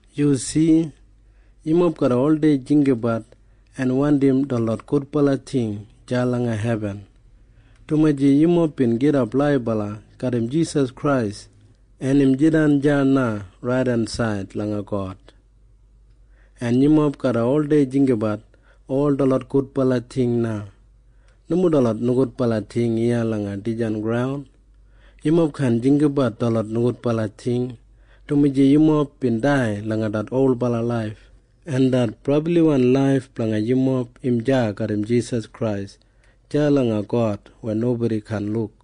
Yu si? Yumob garra oldei jinggabat en wandim detlot gudbala ting deya langa hebin, dumaji yumob bin gidap laibala garram Jisas Krais, en im jidan deya na raidensaid langa God. En yumob garra oldei jinggabat ol detlot gudbala ting na, nomo detlot nogudbala ting iya langa dijan graun. Yumob kaan jinggabat detlot nogudbala ting, dumaji yumob bin dai langa det olbala laif, en det brabliwan laif blanga yumob im deya garram Jisas Krais deya langa God weya nobodi kaan luk.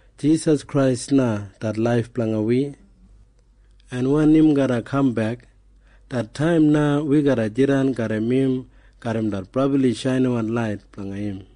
Jisas Krais na det laif blanga wi. En wen im garra kambek, det taim na wi garra jidan garram im garram det brabli shainiwan lait blanga im.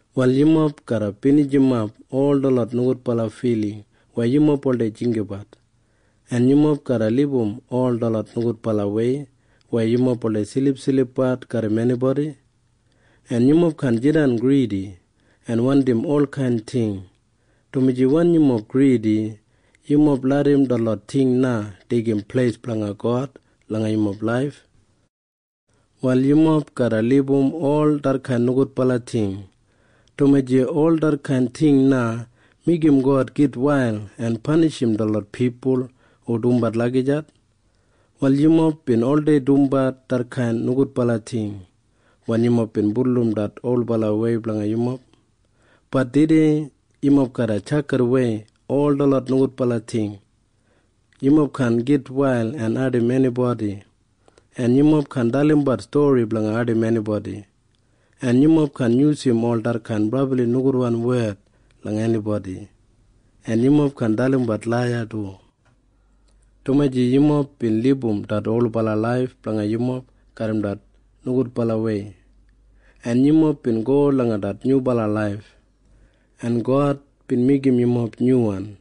Wal yumob garra binijimap ol detlot nogudbala filing weya yumob oldei jinggabat, en yumob garra libum ol detlot nogudbalawei weya yumob oldei silipsilipbat garram enibodi, en yumob kaan jidan gridi en wandim olkain ting, dumaji wen yumob gridi, yumob larram detlot ting na deigim pleis blanga God langa yumob laif. Wal yumob garra libum ol detkain nogudbala ting, dumaji ol detkain ting na meigim God gitwail en panishim detlot pipul hu dumbat lagijat. Wal yumob bin oldei dumbat detkain nogudbala ting wen yumob bin bulurrum det olbalawei blanga yumob. Bat tudei yumob garra tjakidawei ol detlot nogudbala ting. Yumob kaan gitwail en ardim enibodi, en yumob kaan dalimbat stori blanga ardim enibodi, en yumob kaan yusum ol detlot brabli nogudwan wed langa enibodi, en yumob kaan dalimbat laiya du, dumaji yumob bin libum det olbala laif blanga yumob garram det nogudbalawei, en yumob bin go langa det nyubala laif, en God bin meigim yumob nyuwan,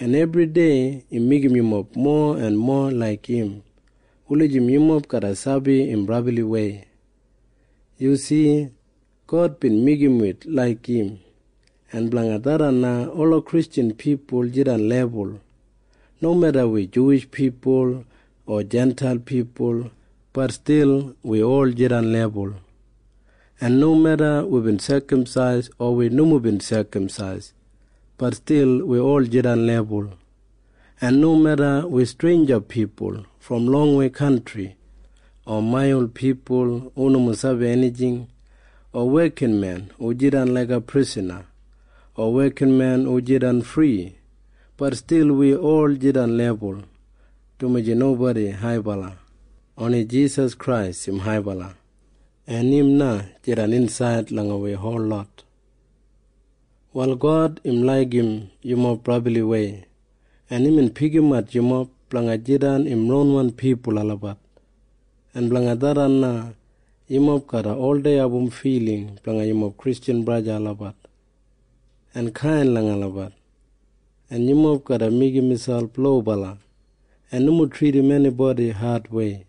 en ebridei im meigim yumob mowa en mowa laik im wulijim yumob garra sabi im brabliwei. Yu si? God bin meigim wi laik im, en blanga tharran na ola Kristjan pipul jidan lebul. Nomeda wi Juwish pipul o Jintail pipul, bat stil wi ol jidan lebul. En nomeda wibin sekamsais o wi nomo bin sekamsais, bat stil wi ol jidan lebul. En nomeda wi streinja pipul brom longwei kantri o maiyal pipul hu nomo sabi enijing o wekinmen hu jidan laiga prisana o wekinmen hu jidan fri, bat stil wi ol jidan lebul, dumaji nobodi haibala. Oni Jisas Krais im haibala. En im na jidan insaid langa wi holot. Wal God im laigim yumob brabliwei, en imbin pikimat yumob blanga jidan im ronwan pipul olabat, en blanga tharran na yumob garra oldei abum filing blanga yumob Kristjan braja en sista olabat en kain langa olabat, en yumob garra meigim miselp lobala en nomo tridim enibodi adwei,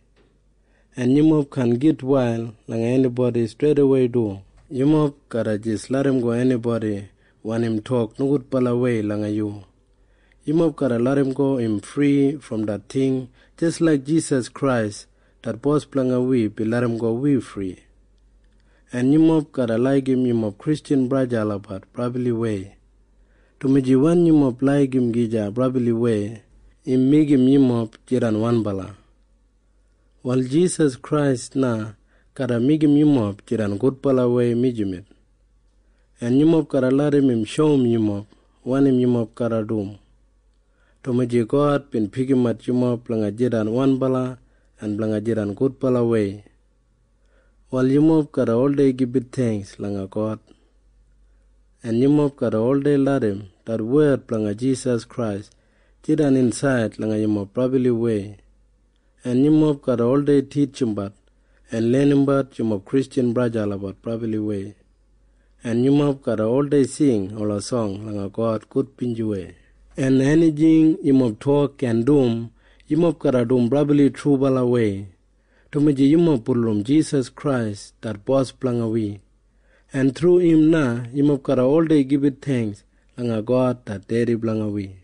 en yumob kaan gitwail langa enibodi streidawei du. Yumob garra jis larramgo enibodi wen im tok nogudbalawei langa yu. Yumob garra larramgo im fri brom det ting jis laik Jisas Krais det Bos blanga wi bin larramgo wi fri. En yumob garra laigim yumob Kristjan braja en sista olabat brabliwei, dumaji wen yumob laigim gija brabliwei, im meigim yumob jidan wanbala. Wal Jisas Krais na garra meigim yumob jidan gudbalawei mijamet. En yumob garra larram im shoum yumob wanim yumob garra dum, dumaji God bin pikimat yumob blanga jidan wanbala en blanga jidan gudbalawei. Wal yumob garra oldei gibit theingks langa God, en yumob garra oldei larram det wed blanga Jisas Krais jidan insaid langa yumob brabliwei, en yumob garra oldei titjimbat en lenimbat yumob Kristjan braja en sista olabat brabliwei, en yumob garra oldei sing ola song langa God gudbinjiwei, en enijing yumob tok en dum, yumob garra dum brabli trubalawei, dumaji yumob bulurrum Jisas Krais det Bos blanga wi, en thru im na yumob garra oldei gibit theingks langa God det Dedi blanga wi.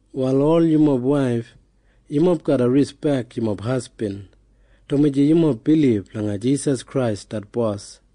Wal ol yumob waif, yumob garra rispek yumob hasbin, dumaji yumob bilib langa Jisas Krais det Bos.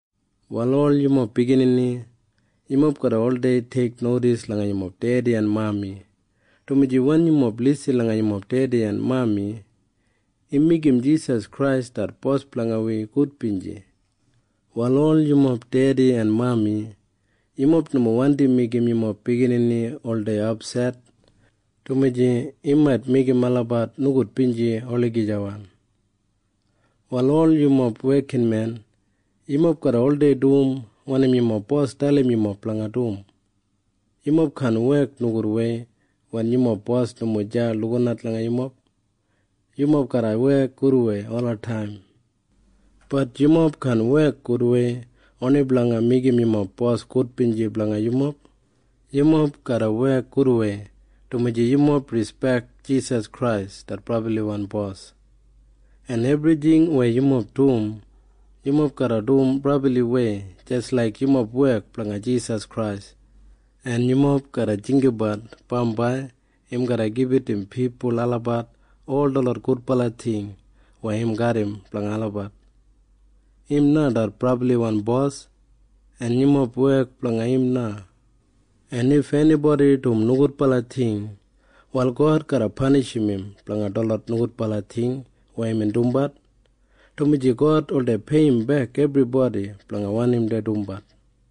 Wal ol yumob biginini, yumob garra oldei teiknodis langa yumob dedi en mami, dumaji wen yumob lisin langa yumob dedi en mami, im meigim Jisas Krais det Bos blanga wi gudbinji. Wal ol yumob dedi en mami, yumob nomo wandi meigim yumob biginini oldei apset, dumaji im mait meigim olabat nogudbinji olagijawan. Wal ol yumob wekinmen, yumob garra oldei dum wanim yumob bos dalim yumob blanga dum. Yumob kaan wek nogudwei wen yumob bos nomo deya lukinat langa yumob. Yumob garra wek gudwei olataim. Bat yumob kaan wek gudwei oni blanga meigim yumob bos gudbinji blanga yumob. Yumob garra wek gudwei dumaji yumob rispek Jisas Krais det brabliwan Bos. En ebrijing weya yumob dum, yumob garra dum brabliwei jis laik yumob wek blanga Jisas Krais, en yumob garra jinggabat bambai im garra gibit im pipul olabat ol detlot gudbala ting weya im garram blanga olabat. Im na det brabliwan Bos, en yumob wek blanga im na, en if enibodi dum nogudbala ting, wal God garra panishim im blanga detlot nogudbala ting weya imbin dumbat, dumaji God oldei peiyimbek ebribodi blanga wanim dei dumbat.